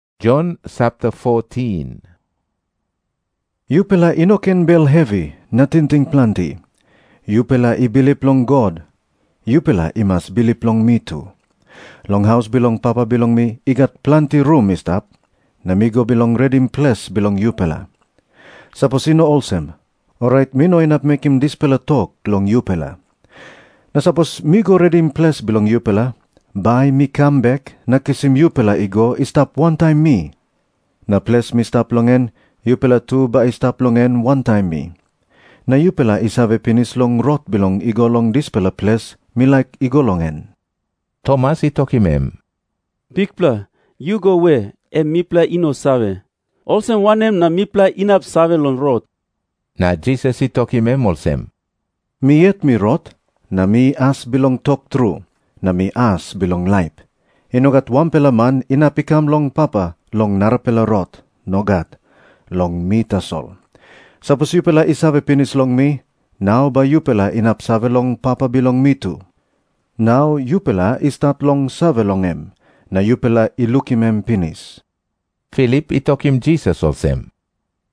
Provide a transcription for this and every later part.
Jisas i tok moa olsem, “Yupela i no ken bel hevi na tingting planti. Yupela i bilip long God. Yupela i mas bilip long mi tu. Long haus bilong Papa bilong mi i gat planti rum i stap, na mi go bilong redim ples bilong yupela. Sapos i no olsem, orait mi no inap mekim dispela tok long yupela. Na sapos mi go redim ples bilong yupela, bai mi kam bek na kisim yupela i go i stap wantaim mi. Na ples mi stap long en, yupela tu bai i stap long en wantaim mi. Na yupela i save pinis long rot bilong i go long dispela ples mi laik i go long en.” Tomas i tokim em, “Bikpela, yu go we, em mipela i no save. Olsem wanem na mipela inap save long rot?” Na Jisas i tokim em olsem, “Mi yet mi rot, na mi as bilong tok tru, na mi as bilong laip. I no gat wanpela man inap i kam long Papa long narapela rot. Nogat. Long mi tasol. Sapos yupela i save pinis long mi, nau bai yupela inap save long Papa bilong mi tu. Nau yupela i stat long save long em. Na yupela i lukim em pinis.” Filip i tokim Jisas olsem,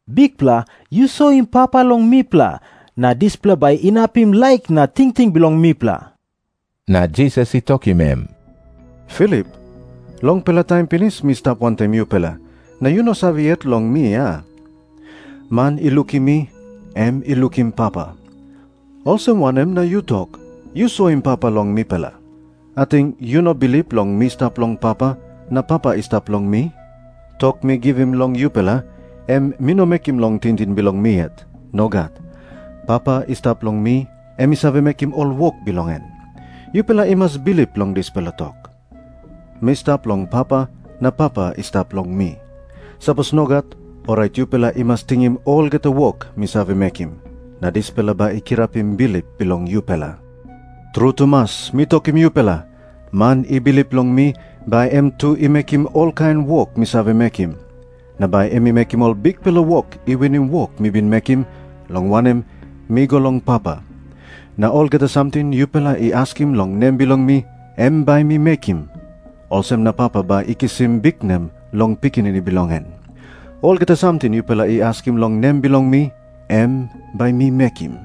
“Bikpela, yu soim Papa long mipela, na dispela bai inapim laik na tingting bilong mipela.” Na Jisas i tokim em, “Filip, longpela taim pinis mi stap wantaim yupela, na yu no save yet long mi, a? Man i lukim mi, em i lukim Papa. Olsem wanem na yu tok, ‘Yu soim Papa long mipela’? Ating yu no bilip long mi stap long Papa, na Papa i stap long mi? Tok mi givim long yupela, em mi no mekim long tingting bilong mi yet. Nogat. Papa i stap long mi, em i save mekim ol wok bilong en. Yupela i mas bilip long dispela tok. Mi stap long Papa, na Papa i stap long mi. Sapos nogat, orait yupela i mas tingim olgeta wok mi save mekim, na dispela bai i kirapim bilip bilong yupela. “Tru tumas mi tokim yupela, man i bilip long mi, bai em tu i mekim olkain wok mi save mekim. Na bai em i mekim ol bikpela wok i winim wok mi bin mekim, long wanem, mi go long Papa. Na olgeta samting yupela i askim long nem bilong mi, em bai mi mekim. Olsem na Papa bai i kisim biknem long Pikinini bilong en. Olgeta samting yupela i askim long nem bilong mi, em bai mi mekim.”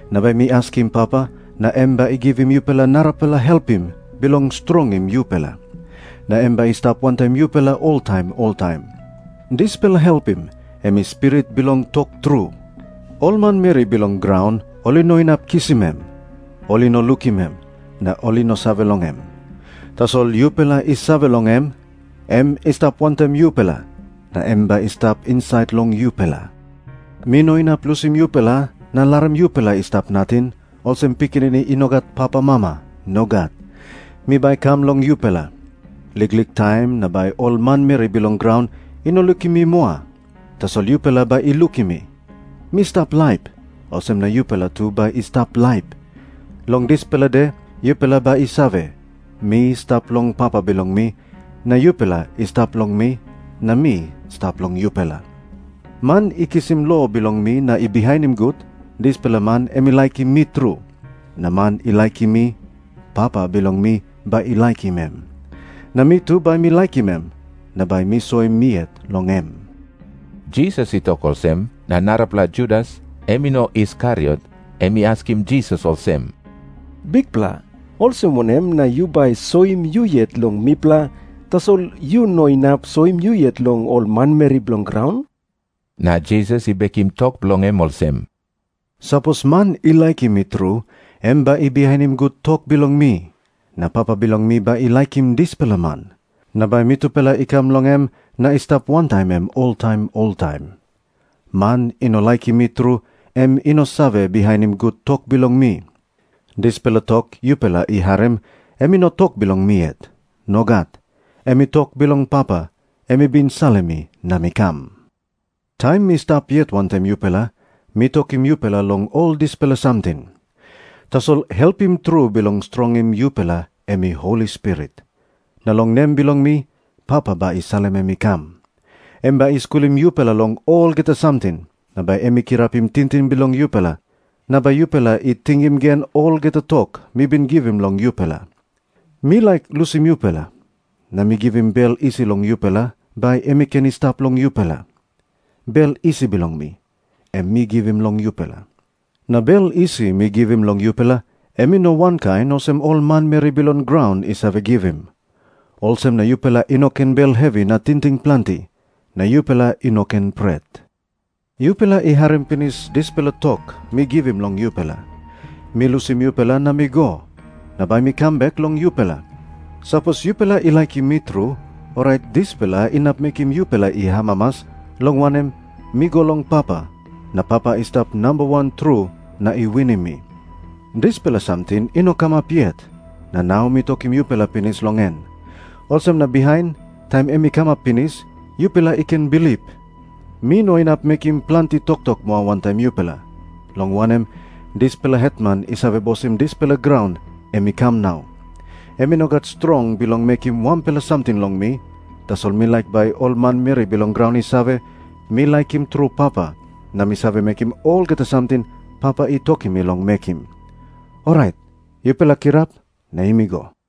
Na bai mi askim Papa, na em bai i givim yupela narapela Helpim bilong strongim yupela. Na em bai i stap wantaim yupela oltaim oltaim. Dispela Helpim em i Spirit bilong tok tru. Ol manmeri bilong graun ol i no inap kisim em. Ol i no lukim em, na ol i no save long em. Tasol yupela i save long em. Em i stap wantaim yupela, na em bai i stap insait long yupela. “Mi no inap lusim yupela na larim yupela i stap nating, olsem pikinini i no gat papamama. Nogat. Mi bai kam long yupela. Liklik taim na bai ol manmeri bilong graun i no lukim mi moa. Tasol yupela bai i lukim mi. Mi stap laip, olsem na yupela tu bai i stap laip. Long dispela de yupela bai i save, mi stap long Papa bilong mi, na yupela i stap long mi, na mi stap long yupela. Man i kisim lo bilong mi na i bihainim gut, dispela man em i laikim mi tru. Na man i laikim mi, Papa bilong mi bai i laikim em. Na mi tu bai mi laikim em, na bai mi soim mi yet long em.” Jisas i tok olsem, na narapela Judas, em i no Iskariot, em i askim Jisas olsem, “Bikpela, olsem wanem na yu bai soim yu yet long mipela, tasol yu no inap soim yu yet long ol manmeri bilong graun?” Na Jisas i bekim tok bilong em olsem, “Sapos man i laikim mi tru, em bai i bihainim gut tok bilong mi. Na Papa bilong mi bai i laikim dispela man. Na bai mitupela i kam long em na i stap wantaim em oltaim oltaim. Man i no laikim mi tru, em i no save bihainim gut tok bilong mi. Dispela tok yupela i harim, em i no tok bilong mi yet. Nogat. Em i tok bilong Papa, em i bin salim mi na mi kam. “Taim mi stap yet wantaim yupela, mi tokim yupela long ol dispela samting. Tasol Helpim tru bilong strongim yupela em i Holi Spirit. Na long nem bilong mi, Papa bai i salim em i kam. Em bai i skulim yupela long olgeta samting. Na bai em i kirapim tingting bilong yupela na bai yupela i tingim gen olgeta tok mi bin givim long yupela. “Mi laik lusim yupela, na mi givim bel isi long yupela bai em i ken i stap long yupela. Bel isi bilong mi, em mi givim long yupela. Na bel isi mi givim long yupela, em i no wankain olsem ol manmeri bilong graun i save givim. Olsem na yupela i no ken bel hevi na tingting planti, na yupela i no ken pret. Yupela i harim pinis dispela tok mi givim long yupela, ‘Mi lusim yupela na mi go. Na bai mi kam bek long yupela.’ Sapos yupela i laikim mi tru, orait dispela inap mekim yupela i amamas, long wanem, mi go long Papa, na Papa i stap namba wan tru na i winim mi. Dispela samting i no kamap yet, na nau mi tokim yupela pinis long en. Olsem na bihain, taim em i kamap pinis, yupela i ken bilip. “Mi no inap mekim planti toktok moa wantaim yupela, long wanem, dispela hetman i save bosim dispela graun em i kam nau. Em i no gat strong bilong mekim wanpela samting long mi, tasol mi laik bai ol manmeri bilong graun i save, mi laikim tru Papa, na mi save mekim olgeta samting Papa i tokim mi long mekim. Orait yupela kirap, na yumi go.”